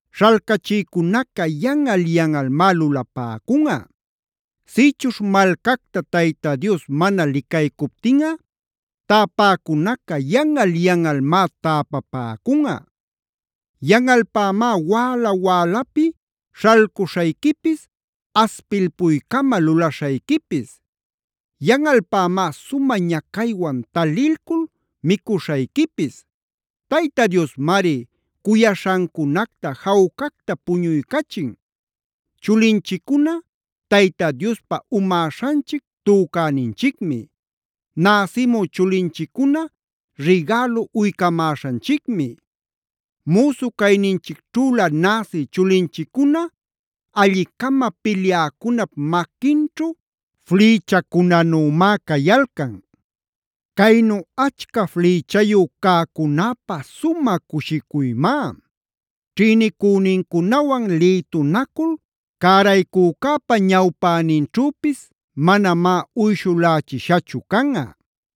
śhalcachïcunaca yanꞌal-yanꞌalmá lulapäcunꞌa. Sïchuśh malcacta Tayta Dios mana licaycuptinꞌa täpäcunaca yanꞌal-yanꞌalmá täpapäcunꞌa. Yanꞌalpämá wäla-wälapi śhalcuśhayquipis, aspilpuycama lulaśhayquipis. Yanꞌalpämá sumä ñacaywan talilcul micuśhayquipis. Tayta Diosmari cuyaśhancunacta jawcacta puñuycachin. Chulinchiccuna Tayta Diospa umäśhanchic tücäninchicmi. Näsimü chulinchiccuna rigälu uycamäśhanchicmi. Müsu cayninchicćhülä näsi chulinchiccuna alli-cama pilyäcunap maquinćhu flïchacunänümá cayalcan. Caynu achca flïchayu cäcunäpä sumä cushicuymá. Ćhïnicünincunawan lïtunacul cäraycücäpa ñawpäninćhüpis manamá uyshulächishachu canꞌa.